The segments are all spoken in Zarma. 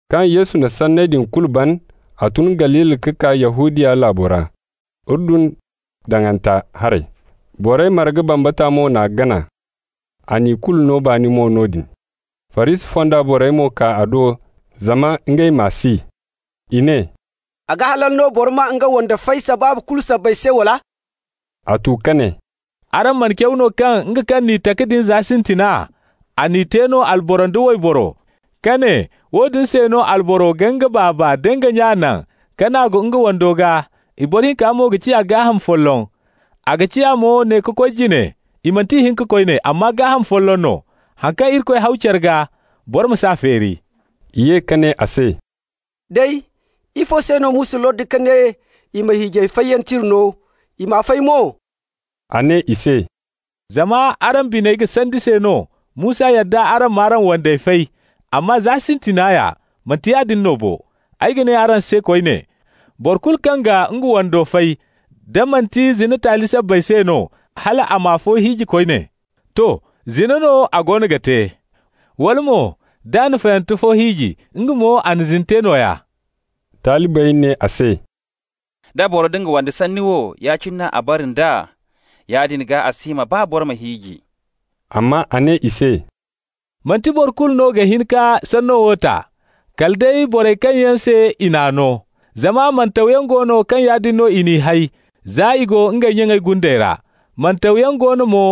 Kaŋ Yesu na sanney din kulu ban, a tun Galili ka kaa Yahudiya laabo ra, Urdun daŋanta haray. Borey marga bambata mo n'a gana, a n'i kulu no baani mo noodin. Farisi fonda borey mo kaa a do zama ngey m'a si. I ne: «A ga halal no boro ma nga wande fay sabaabu kulu sabbay se, wala?» A tu ka ne: «Araŋ mana caw no kaŋ nga kaŋ n'i taka din za sintina, a n'i te no alboro nda wayboro, ka ne: ‹woodin se no alboro ga nga baaba nda nga nya naŋ, ka naagu nga wando gaa, i boro hinka mo ga ciya gaaham folloŋ.› A ga ciya mo ne ka koy jine i manti ihinka koyne, amma gaaham folloŋ no. Haŋ kaŋ Irikoy haw care gaa, boro ma s'a feeri.» I ye ka ne a se: «Day, ifo se no Musa lordi ka ne i ma hiijay fayyaŋ tira no, i ma fay mo?» A ne i se: «Zama araŋ biney ga sandi se no Musa yadda araŋ m'araŋ wandey fay. Amma za sintina ya, manti yaadin no bo. Ay ga ne araŋ se koyne: boro kulu kaŋ ga nga wando fay, da manti zina taali sabbay se no, hal a ma afo hiiji koyne -- to, zina no a goono ga te. Wala mo, d'a na fayante fo hiiji, nga mo a na zina te nooya.» Talibey ne a se: «Da boro nda nga wando sanni wo, ya-cine no a bara nd'a, yaadin gaa a si hima baa boro ma hiiji.» Amma a ne i se: «Manti boro kulu no ga hin ka sanno wo ta, kala day borey kaŋ yaŋ se i n'a no. Zama mantawyaŋ go no kaŋ yaadin no i n'i hay za i go ngey nyaŋey gunde ra. Mantawyaŋ go no mo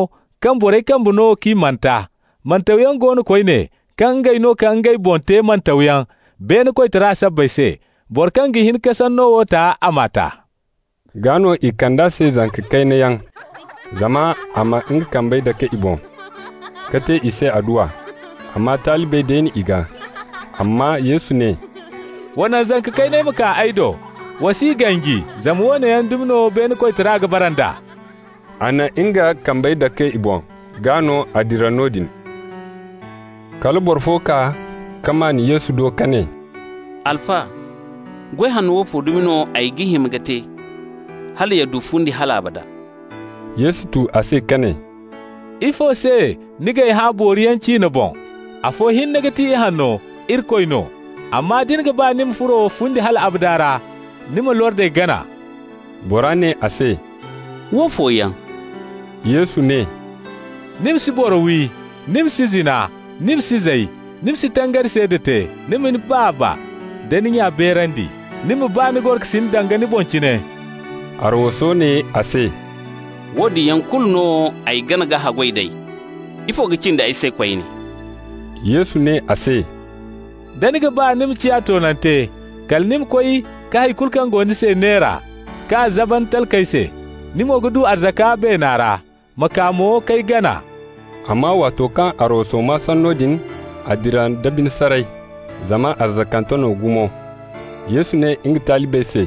kaŋ borey kambe no k'i manta. Mantawyaŋ go no koyne kaŋ ngey no ka ngey boŋ te mantawyaŋ beene koytara sabbay se. Boro kaŋ ga hin ka sanno wo ta, a m'a ta.» Gaa no i kand'a se zanka kayna yaŋ, zama a ma nga kambey dake i boŋ ka te i se adduwa, amma talibey deeni i gaa. Amma Yesu ne: «Wa naŋ zanka kayney ma kaa ay do. Wa s'i ganji, zama woone yaŋ dumi no beene koytara ga bara nd'a.» A na nga kambey dake i boŋ, gaa no a dira noodin. Kala boro fo kaa ka maan Yesu do ka ne: «Alfa, goy hanno woofo dumi no ay ga hima ka te, hala ya du fundi hal abada?» Yesu tu a se ka ne: «Ifo se ni g'ay hã booriyaŋ ciine boŋ? Afo hinne ga ti ihanno, Irikoy no. Amma da ni ga ba ni ma furo fundi hal abada ra, ni ma lordey gana.» Bora ne a se: «Woofo yaŋ?» Yesu ne: «Ni ma si boro wi, ni ma si zina, ni ma si zay, ni ma si tangari seeda te, ni ma ni baaba nda ni nya beerandi, ni ma ba ni gorokasin danga ni boŋ cine.» Arwaso ne a se: «Woodin yaŋ kulu no ay gana ka haggoy d'ey. Ifo ka cindi ay se koyne?» Yesu ne a se: «Da ni ga ba ni ma ciya toonante, kala ni ma koy ka hay kulu kaŋ go ni se neera, k'a zaban talkey se -- ni mo ga du arzaka beena ra. Ma kaa mo k'ay gana.» Amma waato kaŋ arwaso maa sanno din, a dira nda bine saray, zama arzakante no gumo. Yesu ne nga talibey se: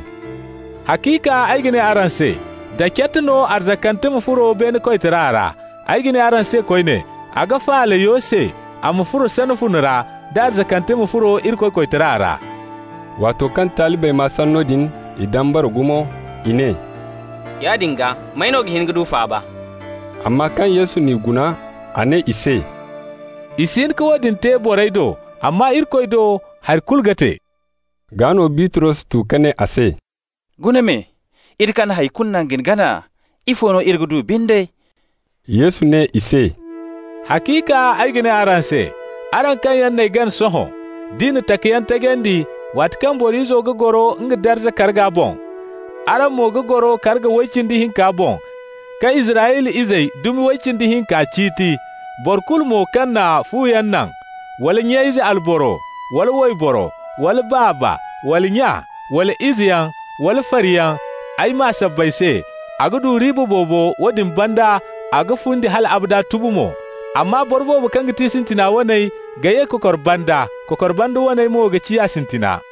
«Haciika ay ga ne araŋ se: da cat no arzakante ma furo beene koytara ra. Ay ga ne araŋ se koyne, a ga faala yo se a ma furo sana fune ra, da arzakante ma furo Irikoy koytara ra.» Waato kaŋ talibey maa sanno din, i dambara gumo. I ne: «Yaadin gaa, may no ga hin ka du faaba?» Amma kaŋ Yesu n'i guna, a ne i se: «I si hin ka woodin te borey do, amma Irikoy do hari kulu ga te.» Gaa no Bitros tu ka ne a se: «Guna me, iri kaŋ na hay kulu naŋ ka ni gana, ifo no iri ga du binde?» Yesu ne i se: «Haciika ay ga ne araŋ se: araŋ kaŋ yaŋ n'ay gana sohõ, d'i na takayaŋ tajandi, waati kaŋ Boro Izo ga goro nga darza karga boŋ, araŋ mo ga goro karga way cindi hinka boŋ, ka Israyla izey dumi way cindi hinka ciiti. Boro kulu mo kaŋ na fuyaŋ naŋ, wala nya-ize alboro wala wayboro, wala baaba, wala nya, wala izeyaŋ, wala fariyaŋ, ay maa sabbay se, a ga du riiba boobo, woodin banda a ga fundi hal abada tubu mo. Amma boro boobo kaŋ ga ti sintina waney ga ye kokor banda, kokor banda waney mo ga ciya sintina.